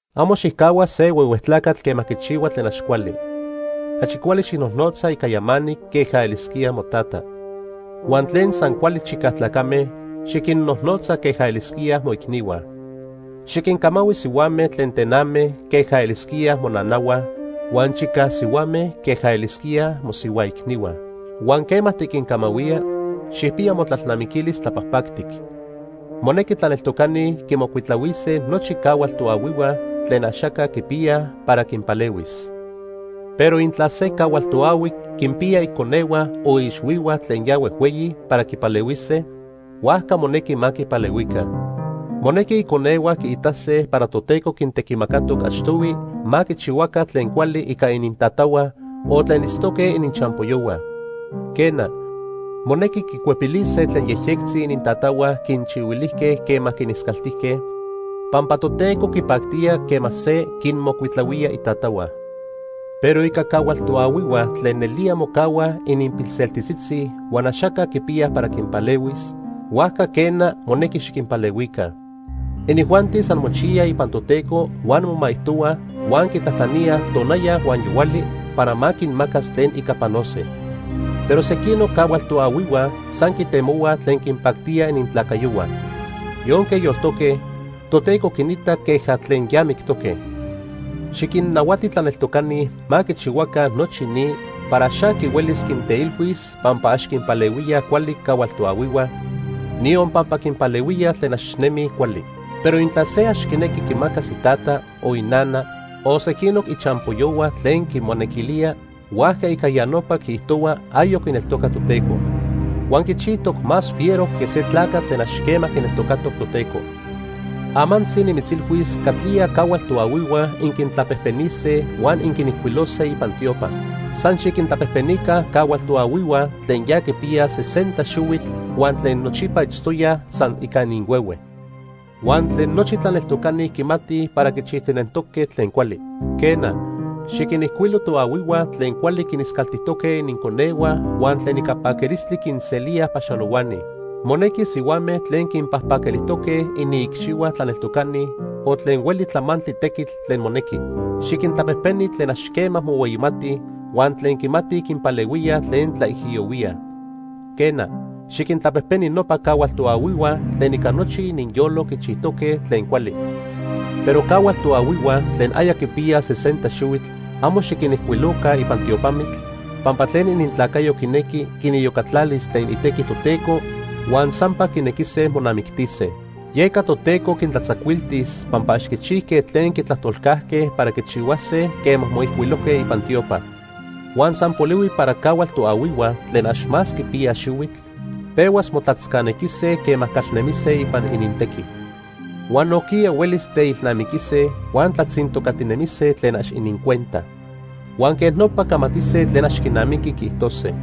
Amo xicajhua se huehue tlacatl quema quichihua tlen ax cuali. Achi cuali xijnojnotza ica yamanic queja elisquía motata. Huan tlen san cuali chicaj tlacame, xiquinnojnotza queja elisquíaj moicnihua. Xiquincamahui sihuame tlen tename queja elisquíaj monanahua huan chicaj sihuame queja elisquíaj mosihua icnihua. Huan quema tiquincamahuía, xijpiya motlalnamiquilis tlapajpactic. Monequi tlaneltocani quimocuitlahuise nochi cahual toahuihua tlen axaca quipiyaj para quinpalehuis. Pero intla se cahual toahui quinpiya iconehua o iixhuihua tlen ya huejhueyi para quipalehuise, huajca monequi ma quipalehuica. Monequi iconehua quiitase para Toteco quintequimacatoc achtohui ma quichihuaca tlen cuali ica inintatahua o tlen itztoque ininchampoyohua. Quena, monequi quicuepilise tlen yejyectzi inintatahua quinchihuilijque quema quiniscaltijque, pampa Toteco quipactía quema se quinmocuitlahuía itatahua. Pero ica cahual toahuihua tlen nelía mocahuaj ininpilseltitzitzi huan axaca quipiyaj para quinpalehuis, huajca, quena, monequi xiquinpalehuica. Inijuanti san mochiyaj ipan Toteco huan momaijtohuaj huan quitlajtlaníaj tonaya huan yohuali para ma quinmacas tlen ica panose. Pero sequinoc cahual toahuihua san quitemohuaj tlen quinpactía inintlacayohua. Yonque yoltoque, Toteco quinita queja tlen ya mictoque. Xiquinnahuati tlaneltocani ma quichihuaca nochi ni para ax aqui huelis quinteilhuis pampa ax quinpalehuíaj cuali cahual toahuihua, niyon pampa quinpalehuíaj tlen ax nemij cuali. Pero intla se ax quinequi quimacas itata, o inana, o sequinoc ichampoyohua tlen quimonequilía, huajca ica ya nopa quiijtohua ayoc quineltoca Toteco. Huan quichijtoc más fiero que se tlacatl tlen ax quema quineltocatoc Toteco. Amantzi nimitzilhuis catlía cahual toahuihua inquintlapejpenise huan inquinijcuilose ipan tiopa. San xiquintlapejpenica cahual toahuihua tlen ya quipiyaj sesenta xihuitl huan tlen nochipa itztoyaj san ica ininhuehue, huan tlen nochi tlaneltocani quimatij para quichijtinentoque tlen cuali. Quena, xiquinijcuilo toahuihua tlen cuali quiniscaltijtoque ininconehua huan tlen ica paquilistli quinselíaj paxalohuani. Monequi sihuame tlen quinpajpaquilijtoque iniicxihua tlaneltocani o tlen hueli tlamantli tequitl tlen monequi. Xiquintlapejpeni tlen ax quema mohueyimatij huan tlen quimatij quinpalehuíaj tlen tlaijiyohuíaj. Quena, xiquintlapejpeni nopa cahual toahuihua tlen ica nochi ininyolo quichijtoque tlen cuali. Pero cahual toahuihua tlen aya quipiyaj sesenta xihuitl amo xiquinijcuiloca ipan tiopamitl, pampa tlen inintlacayo quinequi, quiniyocatlalis tlen itequi Toteco huan sampa quinequise monamictise. Yeca Toteco quintlatzacuiltis pampa ax quichijque tlen quitlajtolcajque para quichihuase quema moijcuilojque ipan tiopa. Huan san polihui para cahual toahuihua tlen ax más quipiyaj xihuitl pehuas motlatzcanequise quema calnemise ipan inintequi. Huan nojquiya huelis teilnamiquise, huan tlatzintocatinemise tlen ax inincuenta. Huan quej nopa camatise tlen ax quinamiqui quiijtose.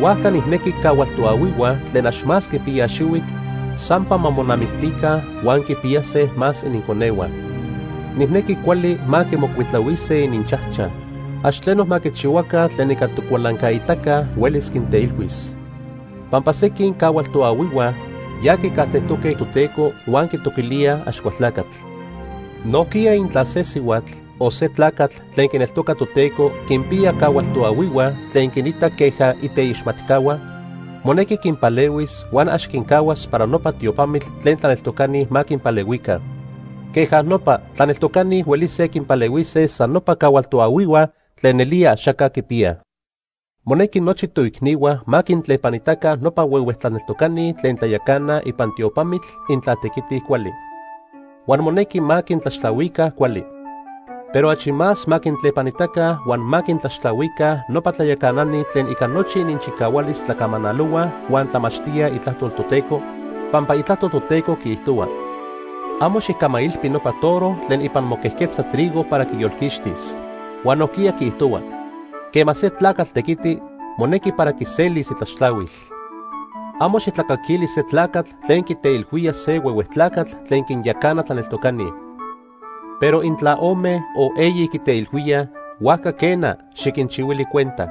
Huajca nijnequi cahual toahuihua tlen ax más quipiyaj xihuitl sampa ma monamictica huan quipiyase más ininconehua. Nijnequi cuali ma quimocuitlahuise ininchajchaj. Ax tleno ma quichihuaca tlen ica tocualancaitaca huelis quinteilhuis. Pampa sequin cahual toahuihua ya quicajtejtoque Toteco huan quitoquilíaj Axcualtlacatl. Nojquiya intla se sihuatl o se tlacatl tlen quineltoca Toteco quinpiya cahual toahuihua tlen quinita queja iteixmatcahua, monequi quinpalehuis huan ax quincahuas para nopa tiopamitl tlen tlaneltocani ma quinpalehuica. Queja nopa, tlaneltocani huelise quinpalehuise san nopa cahual toahuihua tlen nelía axaca quipiyaj. Monequi nochi toicnihua ma quintlepanitaca nopa huehue tlaneltocani tlen tlayacanaj ipan tiopamitl intla tequitij cuali. Huan monequi ma quintlaxtlahuica cuali. Pero achi más ma quintlepanitaca huan ma quintlaxtlahuica nopa tlayacanani tlen ica nochi ininchicahualis tlacamanalohuaj huan tlamachtíaj Itlajtol Toteco, pampa Itlajtol Toteco quiijtohua: “Amo xijcamailpi nopa toro tlen ipan moquejquetza trigo para quiyolquixtis.” Huan nojquiya quiijtohua: “Quema se tlacatl tequiti, monequi para quiselis itlaxtlahuil.” Amo xijtlacaquili se tlacatl tlen quiteilhuía se huehue tlacatl tlen quinyacana tlaneltocani. Pero intla ome o eyi quiteilhuíaj, huajca quena, xiquinchihuili cuenta.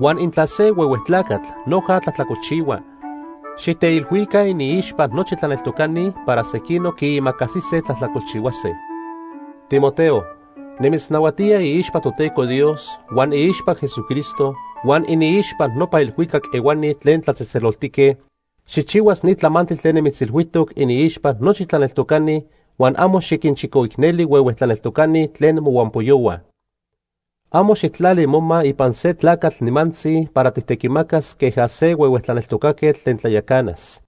Huan intla se huehue tlacatl noja tlajtlacolchihua, xijteilhuica iniixpa nochi tlaneltocani para sequinoc quiimacasise tlajtlacolchihuase. Timoteo, nimitznahuatía iixpa Toteco Dios, huan iixpa Jesucristo, huan iniixpa nopa elhuicac ehuani tlen tlatzejtzeloltique, xijchihuas ni tlamantli tlen nimitzilhuijtoc iniixpa nochi tlaneltocani huan amo xiquinchicoicneli huehue tlaneltocani tlen mohuampoyohua. Amo xijtlali moma ipan se tlacatl nimantzi para tijtequimacas queja se huehue tlaneltocaquetl tlen tlayacanas.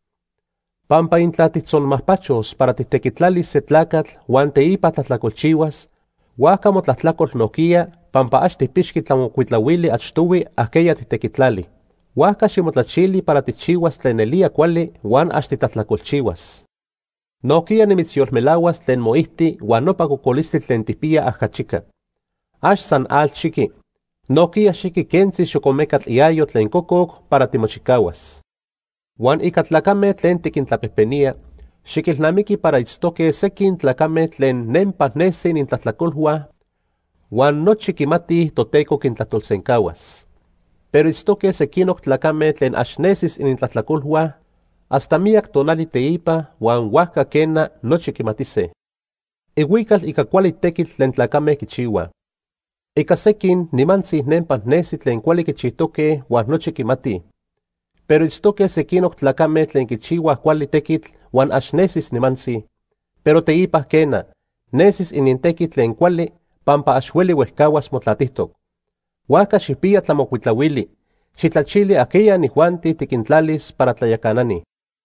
Pampa intla tijtzonmajpachos para tijtequitlalis se tlacatl huan teipa tlajtlacolchihuas, huajca motlajtlacol nojquiya pampa ax tijpixqui tlamocuitlahuili achtohui ajqueya tijtequitlali. Huajca ximotlachili para tijchihuas tlen nelía cuali huan ax titlajtlacolchihuas. Nojquiya nimitzyolmelahuas tlen moijti huan nopa cocolistli tlen tijpiya ajachica. Ax san atl xiqui, nojquiya xiqui quentzi xocomecatl iayo tlen cococ para timochicahuas. Huan ica tlacame tlen tiquintlapejpenía, xiquilnamiqui para itztoque sequin tlacame tlen nempa nesi inintlajtlacolhua huan nochi quimatij Toteco quintlajtolsencahuas. Pero itztoque sequinoc tlacame tlen ax nesis inintlajtlacolhua hasta miyac tonali teipa huan huajca quena, nochi quimatise. Ihuical ica cuali tequitl tlen tlacame quichihuaj. Ica sequin nimantzi nempa nesi tlen cuali quichijtoque huan nochi quimatij. Pero itztoque sequinoc tlacame tlen quichihuaj cuali tequitl huan ax nesis nimantzi, pero teipa quena, nesis inintequi tlen cuali pampa ax hueli huejcahuas motlatijtoc. Huajca xijpiya tlamocuitlahuili xijtlachili ajqueya inijuanti tiquintlalis para tlayacanani.